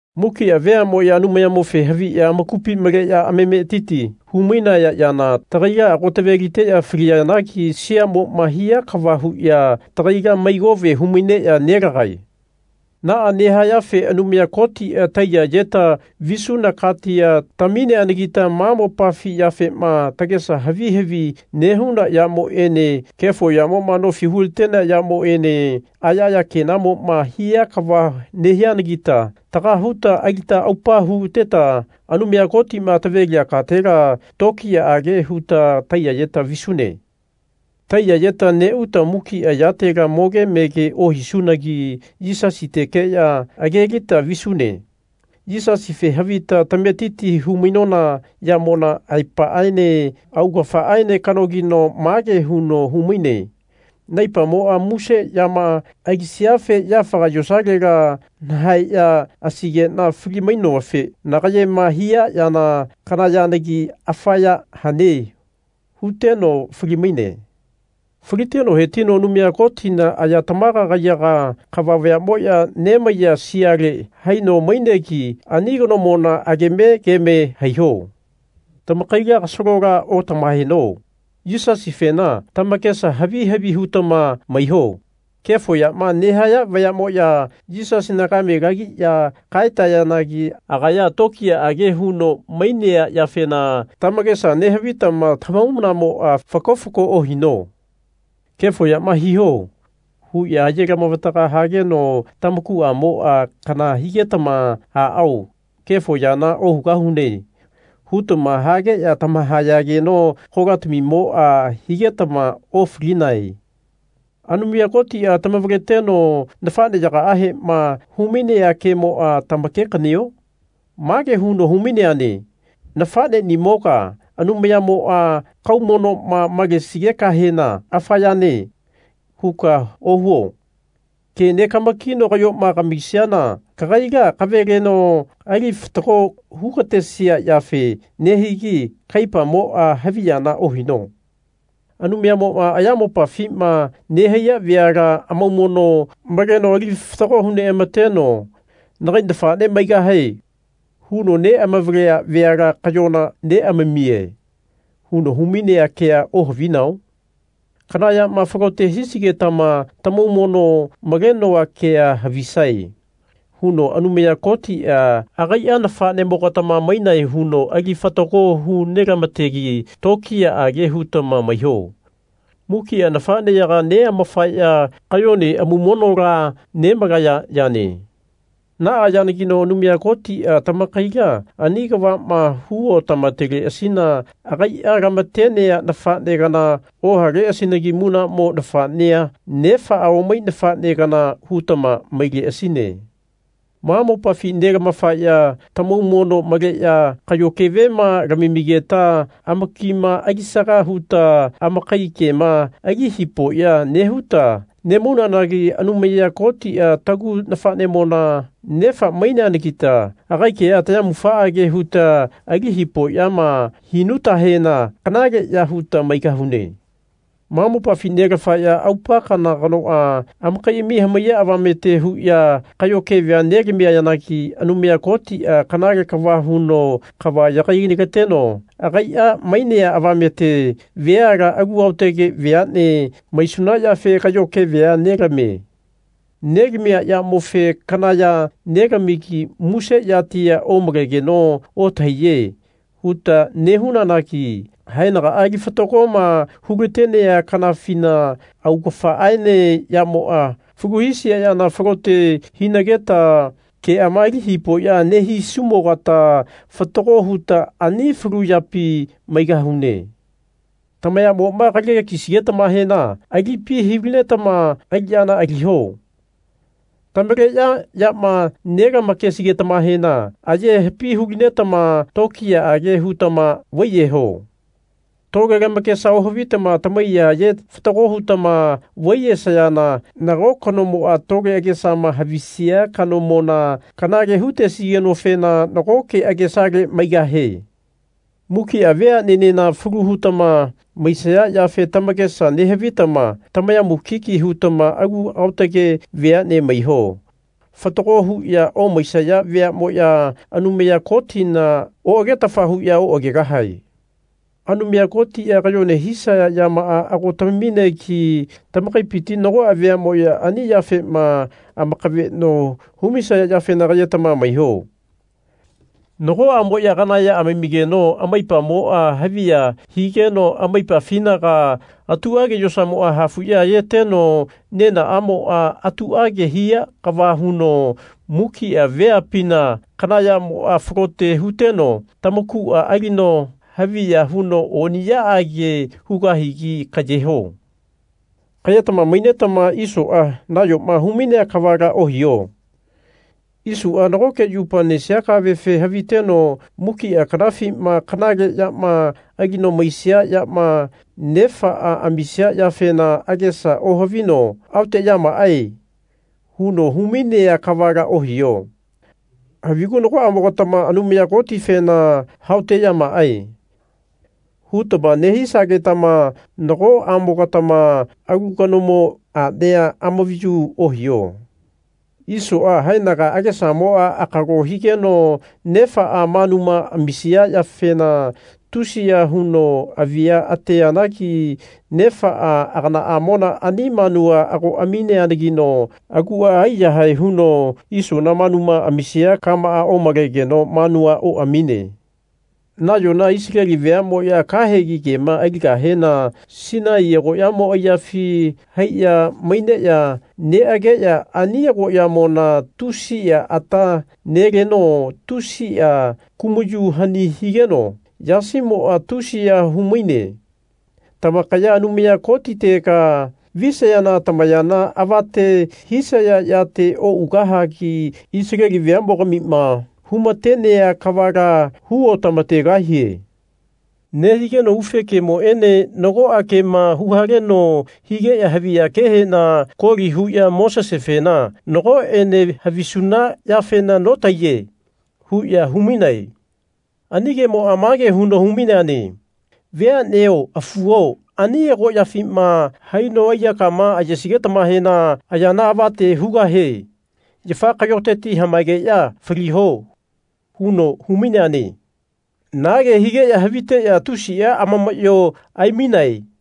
Mukia veamoya Anumayamofe haviya amakupi maleya amametiti hu-mainaya yana tagaila ago taveliteya faliyanagi siamoma hia kava huya tagaila mai kove humaineya nelagae. Naa nehayafe Anumaya Kotia taiya-yeta visuna katia tamineanagita ma mopafi yafema tagesa havi havi nehuna yamoene kefo yamoma nofi hulatenea yamoene aya aya kenamoma hia kava nehianagita taga huta alita aupa huteta Anumaya Kotima tavelia katela tokiyaage huta taiya-yeta visune. Taiya-yeta neuta mukia yatela moge mege ohisunagi Yisasitekeya agelita visune. Yisasife havita tametiti hu-mainona yamona aepaaene augafaaene kanogino mage huno humaine Naipamoa muse yama alisiafe yafaga yosalela nahaeya asaigena fali-mainofe nagayema hia yana kana yanagi afa ya hane. huteno fali-maine. Faliteno hetino Anumaya Kotina aya tamaga kaiyaga, kava vayamoya nemaiya siale haino mainegi ani kanomona ageme geme haiho. Tamakaila kasalola otamahaeno. Yisasifena tamakesa havi havi hutama maiho. Kefo yama nehaya vayamoya Yisasina kame lagiya kaetayanagi agaya tokiyaage huno mainea yafena tamakesa nehavitama tamahaumanamoa faki faki ohino. Kefo yama hiho. huya aye lamavataga hageno tamakuamoa kana higetama Aao, kefo yana ohugahune. hutama hageya tamahayageno kolatamimoa higetama ofalinae. Anumaya Kotia tamavaleteno nafaneyagaahema humainea kemoa tamake-kanio? Mage huno hu-maineane Nafanenimoga Anumayamoa kaumonoma malesigekahena Afa yane. huka ohuo. Ke negama-kino kayoma kamisiana kagaila kavaleno ali fatago hugatesia yafe nehigi kaipamoa haviyana ohino. Anumayamoa ayamopafima nehaiya veala amaumono maleno ali fatago hu neamateno. Nagai nafane maigahae. huno neamavalea veala kayona neamamie. huno humainea kea ohavinao? Kana yama falote hisigetama Tamaumono malenoa kea havisae. huno Anumaya Kotia agaia nafanemogatama mainae huno ali fatago hu nelamategi tokiyaage hutama maiho. Mukia nafaneyaga neamafaya kayona amaumonola nemalaya yane. Naa yanagino Anumaya Kotia tamakaila ani kavama hu otamateleasina agaia lamatenea nafane kana ohaleasinagi munamo nafanea, nefaa omai nafane kana hutama maileasine. Ma mopafi nelamafaya tamaumono maleya kayo kevema lamamigeta amakima alisaga huta amakai kema ali hipoya nehuta nemaunanagi Anumaya Kotia tagu nafanemo nefa maineanagita agai kea tayamufaage huta ali hipoyama hinutahena kanaleya huta maigahune. Ma mopafi nelafaya aupa kana kanoa amakaiami hamaiya avamete huya kayo kevea nelamiyanagi Anumaya Kotia kanale kava huno kava yagai-lateno agaia mainea avamete veala alu aotage veane maisuna yafe kayo kevea nelamie. Nelamia yamofe Kana ya nelamigi muse yatia omalegeno otahaiye. huta nehunanagi haenagaa ali fatagoma hulatenea kanafina augafaaene yamoa falu hisia yana falote hinageta keama ali hipoya nehisumogata fatago huta ani falu yapi maigahune. Tamayamoma kalake kisigetamahena alipi hu-linetama aliyana aliho. Tamaleya yama nelama-kesigetamahena ayepi hu-mainetama tokiyaage hutama vaiyeho. Tole lamakesa ohavitama tamaiya aye fatago hutama vaiyesayana nago kanomoa tole agesama havisia kanomona kanale hutesigenofena nagoke agesale maigahie. Mukia veanenena falu hutama maisaya yafe tamakesa nehavitama tamaya mukiki hutama alu aotage veane maiho. Fatago huya omaisaya veamoya Anumaya Kotina oagetafa huya oagegahae. Anumaya Kotia kayone hisaya yamaa ago tamaminegi tamakaipiti nagoa veamoya ani yafema amakaveno humisaya yafena kayetama maiho. Nagoamoya kana ya amamigeno amaipamoa haviya higeno amaipafinaga atuage yosamoa hafuya ayeteno nenaamoa atuage hia kava huno mukia veapina kana yamoa falote huteno tamakua alino haviya huno oniyaage hugahigi kayeho. Kayetama mainetama Isoa nayoma humainea kavala ohiho. Isoa nagoke yupa nesia kavefe haviteno mukia kanafima kanale yama alino maisia yama nefaa amisia yafena agesa ohavino Aoteyamaae. huno humainea kavala ohiho. Havigu nagoamogatama Anumaya Kotifena Haoteyamaae. hutama nehisagetama nagoamogatama alu kanomo anea amavayu ohiho. Isoa haenaga agesamoa akalo higeno nefaa manuma amisia yafena tusiya huno avia ateanagi nefaa aganaamo ani manua ago amineanagino agua aiyahae huno Isona manuma amisia kamaa omalegeno manua oamine. Nayona Isaleli veamoya kahegi kema aligahena Sinai agoyamo aiyafi haiya maineya neageya ani agoyamona tusia ata neleno tusia kumayu hani kigeno yasimoa tusiya humaine. Tamakaya Anumaya Kotitega visayana tamayana avate hisaya yate ougahagi Isaleli veamogamima humatenea kavala hu otamategahie. Nehigeno ufe kemoene nagoa kema huhaleno higeya haviya kehena koli huya Mosesefena Nagoene havisuna yafena notahaiye. huya humainae. Ani kemoa mage huno hu-maineane Veaneo afuo ani agoyafima haino aiyakama ayesigetamahena ayana avate hugahe yafa kayoteti hamaegeya faliho. huno hu-maineane. Na ke higeya haviteya tusia amamayo aimainae.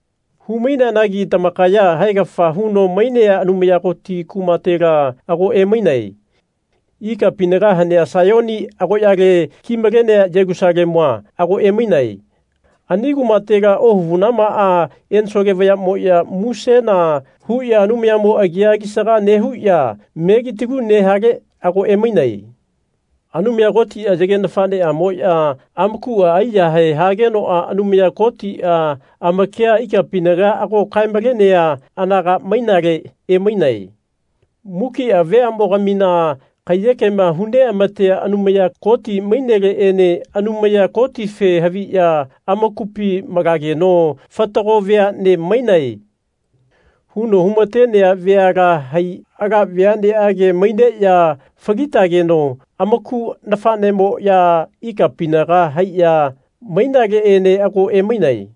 Hu-maineanagi tamakaya haegafa huno mainea Anumaya Koti kumatela ago emainae. Ikapinaga hanea Saiyoni agoyale kimalenea Yelusalemua ago emainae. Ani kumatela ohavunamaa ensole vayamoya musena huya Anumayamo agia alisaga nehuya melitalu nehale ago emainae. Anumaya Kotia yage nafaneamoya amakua aiyahae hageno Anumaya Kotia amakia ikapinaga ago kae-malenea anaga mainale emainae. Mukia veamogamina kaiyekema hu neamatea Anumaya Koti maineleene Anumaya Kotife haviya amakupi malageno Fatago veane mainae. huno humatenea veala hai ala veaneage maineya falitageno amaku nafanemoya ikapinaga haiya mainaleene ago emainae.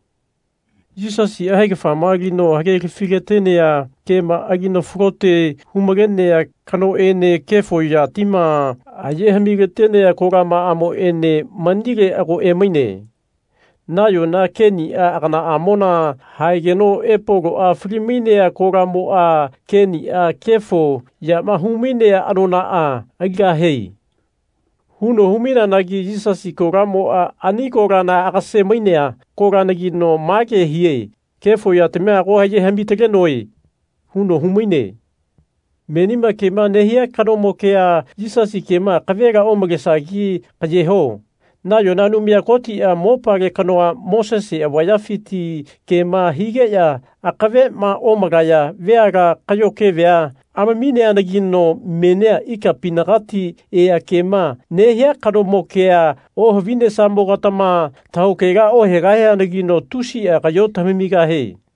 Yisasia haegafama alino hagelafi-latenea kema alino falote hu-malenea kanoene kefo yatima aye hami-talenea kolamaamoene mainele ago emainae. Nayona Kenia aganaamona haegeno Epoloa fali-mainea kolamoa Kenia kefo yama humainea anonaa aligahie. huno hu-maineanagi Yisasi kolamoa ani kolana agase-mainea kolanagino mage hie Kefo yatamia ago aye hami-talenoe. huno humaine. Menima kema nehia kanomo kea, Yisasi kema, akavela omalesagi kayeho. Nayona Anumaya Kotia mopale kanoa Mosese avayafiti, kema higeya akavema omalaya veala kayo kevea amamineanagino menia ikapinagati ea kema nehia kanomo kea ohavinesamogatama tahaokela ohegahianagino tusia kayo tamigahie.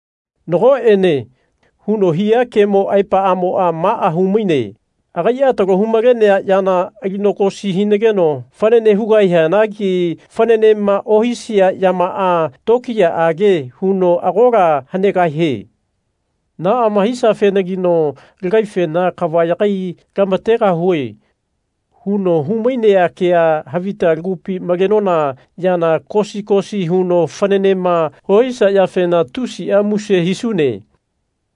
Nagoene. huno hia kemo aepaamoa maa humaine agaia talo hu-malenea yana alino kosi hinageno fanane hugahianagi fananema ohisia yamaa tokiyaage huno agola hanegahie. Naama hisiafenagino lagaifena Kava yagai-lamategahue. huno humainea kea havita lagupi malenona yana kosi kosi huno fananema ohisia yafena tusia muse hisune.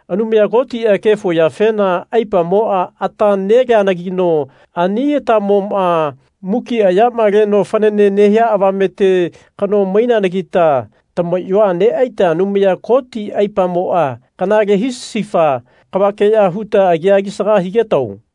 Anumaya Kotia kefo yafena aipamoa ata neleanagino ani atamoma mukia yama leno fanane nehia avamete kano maineanagita tamayoa neaita Anumaya Koti aipamoa kanale hisifa kavakeya huta agia alisaga higetao.